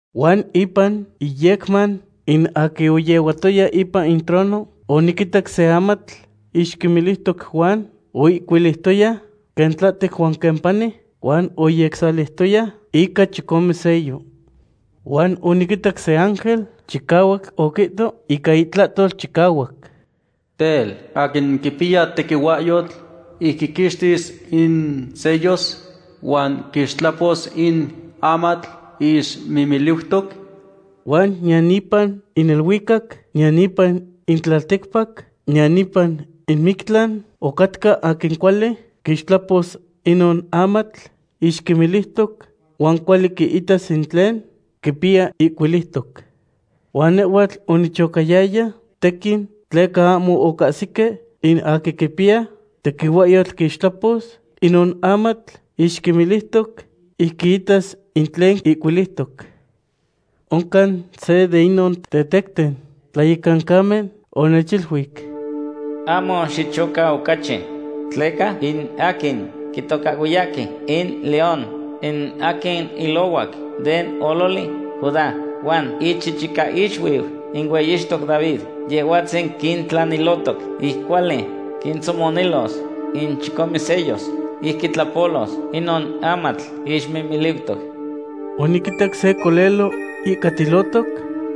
Huan ipan iyecman in aquin oyehuatoya ipan in trono oniquitac se amatl ixmimiliutoc huan oihcuiliutoya quen tlahtec huan quen pani, huan oyecsahsaliutoya ica chicome sello. Huan oniquitac se ángel chicahuac oquihto ica itlahtol chicahuac: ―Tel, ¿aquin quipiya tequihuahyotl ic quiquixtis in sellos, huan quixtlapos in amatl ixmimiliutoc? Huan niyan ipan in neluicac, niyan ipan in tlalticpac, niyan ipan in mictlan ocatca aquin cuali quixtlapos inon amatl ixmimiliutoc, huan cuali quiitas in tlen quipiya ihcuiliutoc. Huan nehhuatl onichocayaya tequin tleca ahmo ocahsique in aquin quipiya tequihuahyotl quixtlapos inon amatl ixmimiliutoc, ic quiitas in tlen ihcuiliutoc. Oncan se de inon tetecten tlayecancamen onechiluic: ―Ahmo xichoca ocachi, tleca in aquin quitocahhuiyahque in León, in aquin ilohuac den ololi Judá, huan ichichicaixuiu in hueyixtoc David, Yehhuatzin quintlanilotoc ic cuali quintzomonilos in chicome sellos ic quitlapolos inon amatl ixmimiliutoc. Oniquitac se colelo ihcatilohtoc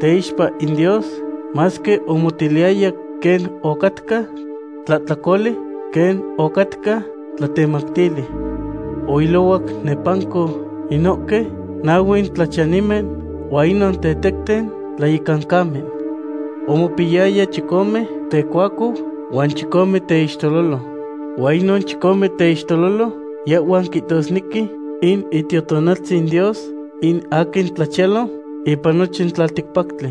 teixpa in Dios, masque omotiliyaya quen ocatca tlacololi, quen ocatca tlatemactili. Oilohuac nepanco inohque nahue tlachiyanimen huan inon tetecten tlayecancamen. Omopiyaya chicome tecuacou huan chicome teixtelolo. Huan inon chicome teixtelolo, yehhuan quihtosnequi in Itiotonaltzin Dios, in aquin tlachiyalo ipan nochin tlalticpactli.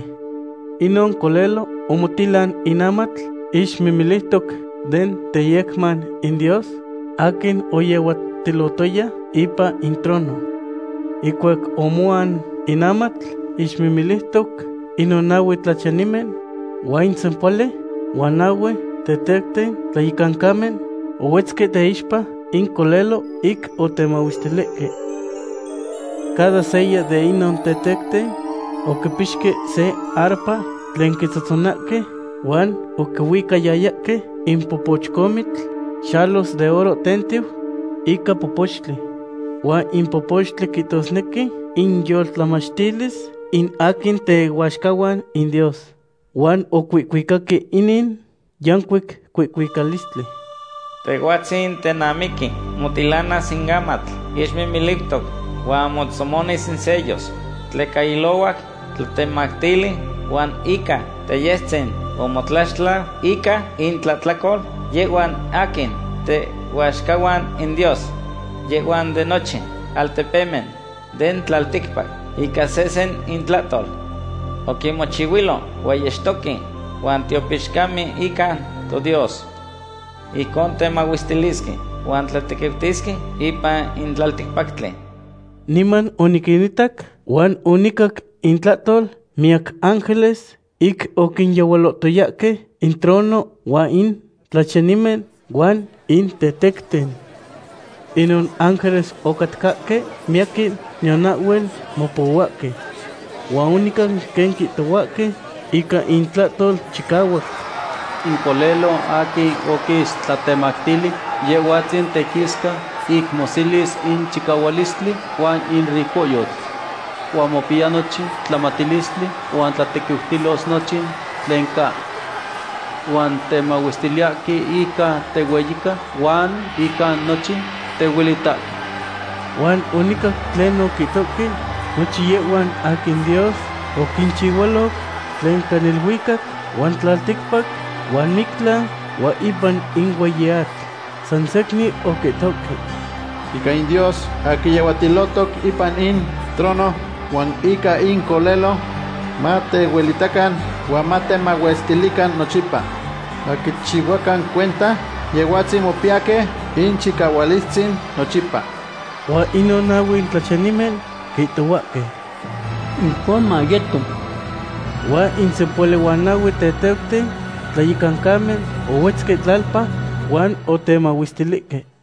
Inon colelo omotilan in amatl ixmimiliutoc den teyecman in Dios aquin oyehuatilotoya ipan in trono. Ihcuac omoan in amatl ixmimiliutoc, inon nahue tlachiyanimen huan in sempohuali huan nahue tetecten tlayecancamen ohuetzque teixpa in colelo ic otemahuestilihque. Cada seya de inon tetecten oquipixque se arpa tlen quitzohtzonahque, huan oquihuicayayahque in popochcomitl xalos de oro tentiu ica popochtli. Huan in popochtli quihtosnequi inyolmachtilis in aquin tehuaxcahuan in Dios. Huan ocuihcuicahque inin yancuic cuihcuicalistli: Tehhuatzin tenamiqui motilanas in amatl ixmimiliutoc huan motzomonis in sellos. Tleca ilohuac tlatemactili huan ica teyestzin omotlaxtlau ica intlahtlacol yehhuan aquin tehuaxcahuan in Dios. Yehhuan den nochin altepemen den tlalticpac, ica sehsen intlahtol. Oquinmochihuilo hueyixtoque huan tiopixcamen ica toDios. Ijcon temahuestilisque huan tlatequiutisque ipan in tlalticpactli. Niman oniquinitac huan onicac intlahtol miyac ángeles ic oquinyehualotoyahque in trono huan in tlachiyanimen huan in tetecten. Inon ángeles ocatcahque miyaquin, niyan ahhuel mopohuahque. Huan onicac quen quihtohuahque ica intlahtol chicahuac: In Colelo aquin oquis tlatemactili, Yehhuatzin tequisca ic moselis in chicahualistli huan in ricohyotl. Huan mopiya nochin tlamatilistli huan tlatequiutilos nochin tlen ca. Huan temahuestiliyahque ica tehueyica huan ica nochin tehuelitahque. Huan onicac tlen oquihtohque nochin yehhuan aquin Dios oquinchihualoc, tlen ca neluicac huan tlalticpac huan mictlan huan ipan in hueyi atl. Sansecnin oquihtohque: ―Ica in Dios aquin yehuatilohtoc ipan in trono huan ica in Colelo, matehuelitacan huan matemahuestilican nochipa. Maquichihuacan cuenta Yehhuatzin mopiyahque in chicahualistzin nochipa. Huan inon nahue tlachiyanimen quihtohuahque: ―¡Ijcon mayeto! Huan in sempohuali huan nahue tetecten tlayecancamen ohuetzque tlalpa huan otemahuestilihque.